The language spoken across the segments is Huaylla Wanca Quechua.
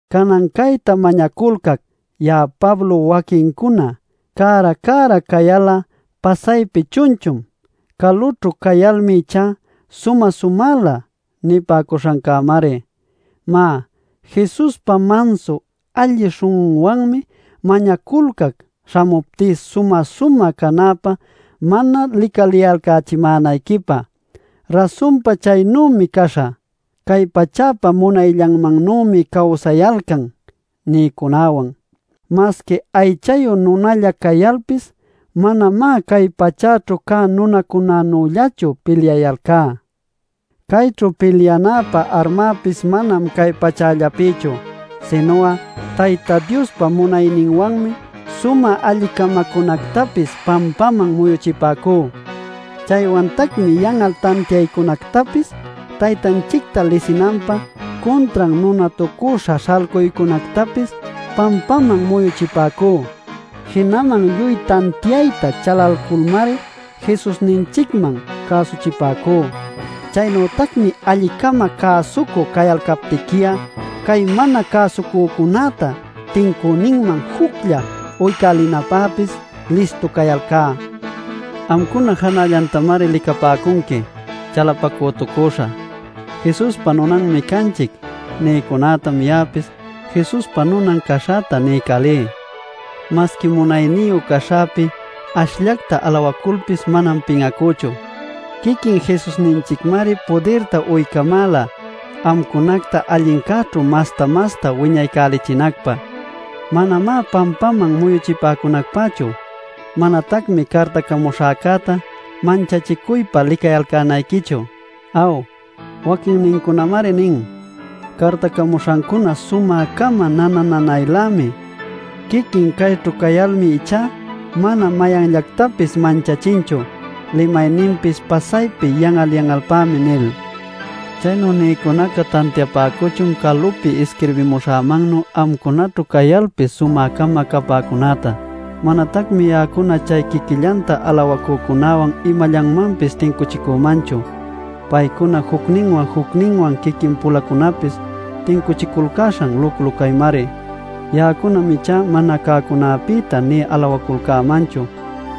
Canan cayta mañaculcac, ya'a Pablo waquincuna “Cära cära cayal'a pasaypi chunchum, calućhu cayalmi ichá sumä-sumälä” nipäcuśhancämari. Má, Jesuspa mansu alli śhun'unwanmi mañaculcac śhamuptí sumä-sumä canäpä mana licaliyalcächimänayquipä. Rasunpa chaynümi caśhä “Cay pachäpa munayllanmannümi cawsayalcan” nïcunawan. Masqui aychayu nunalla cayalpis manamá cay pachäćhu cä nunacunanüllachu pilyayalcá. Cayćhu pilyanäpa armäpis manam cay pachällapïchu, sinu'a Tayta Diospa munayninwanmi sumä alli-camacunactapis pampaman muyuchipäcú. Chaywantacmi yan'al tantiaycunactapis, Taytanchicta lisinanpä cuntran nunatucüśha śhalcuycunactapis pampaman muyuchipäcú. Jinaman lluy tantiayta chalalculmari Jesusninchicman cäsuchipäcú. Chaynütacmi alli-cama cäsucü cayalcaptiqui'a chay mana cäsucücunäta tincüninman juclla uycälinäpäpis listu cayalcá. Amcuna janällantamari licapäcunqui. Chalapacütucüśha “Jesuspa nunanmi canchic” nïcunätam ya'apis Jesuspa nunan caśhäta niycälí. Masqui munayniyu caśhäpi ashllacta alawaculpis manam pin'acüchu. Quiquin Jesusninchicmari pudirta uycamäla amcunacta allincäćhu masta-masta wiñaycälichinacpä, manamá pampaman muyuchipäcunacpächu. Manatacmi cartacamuśhacäta manchachicuypä licayalcänayquichu. Aw, waquinnincunamari nin: “Cartacamuśhancuna sumä-cama nana-nanaylämi. Quiquin cayćhu cayalmi ichá mana mayanllactapis manchachinchu; limayninpis pasaypi yan'al-yan'alpämi” nil. Chaynu nïcunaca tantiapäcuchun calupi isquirbimuśhämannuy amcunaćhu cayalpis sumä-cama capäcunäta. Manatacmi ya'acuna chay quiquillanta alawacücunäwan imallanmanpis tincuchicümanchu. Paycuná jucninwan jucninwan quiquin-puläcunapis tincuchiculcäśhan luclu caymari. Ya'acunam ichá mana cäcunäpïta nï alawaculcämanchu.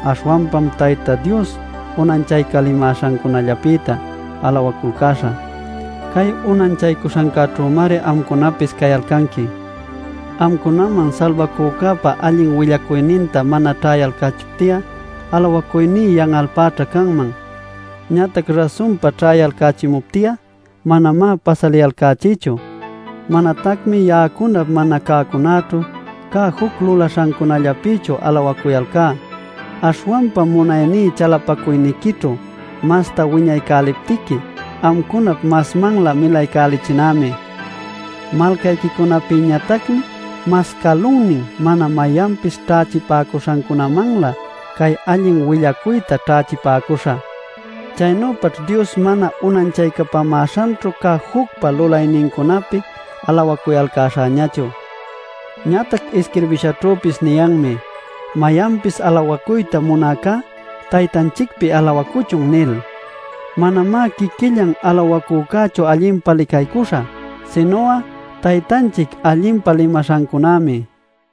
Aśhwanpam Tayta Dios unanchaycapämäśhancunallapïta alawaculcäśhä. Cay unanchaycuśhancäćhümari amcunapis cayalcanqui. Amcunaman Salbacücäpa allin willacuyninta mana ćhaycachipti'a, alawacuyní yan'alćha canman. Ñatac rasunpa ćhayalcächimupti'a manamá pasaliyalcachïchu. Manatacmi ya'acunap mana cäcunäćhu cä juc lulaśhancunallapïchu alawacuyalcá. Aśhwanpa munayní chalapacuyniquićhu masta wiñaycäliptiqui amcunap masmanlä milaycälichinämi. Malcayquicunapïñatacmi mas calunnin mana mayanpis ćhächipäcuśhancunamanlä cay allin willacuyta ćhächipäcuśha. Chaynüpaćh Dios mana unanchaycapämäśhanćhu cä jucpa lulaynincunapïta alawacuyalcäśhächu. Ñatac isquirbishaćhüpis niyanmi: “Mayanpis alawacuyta munäcá, Taytanchicpi alawacuchun” nil. Manamá quiquillan alawacücächu allinpa licaycuśha, sinu'a Taytanchic allinpa limaśhancunämi.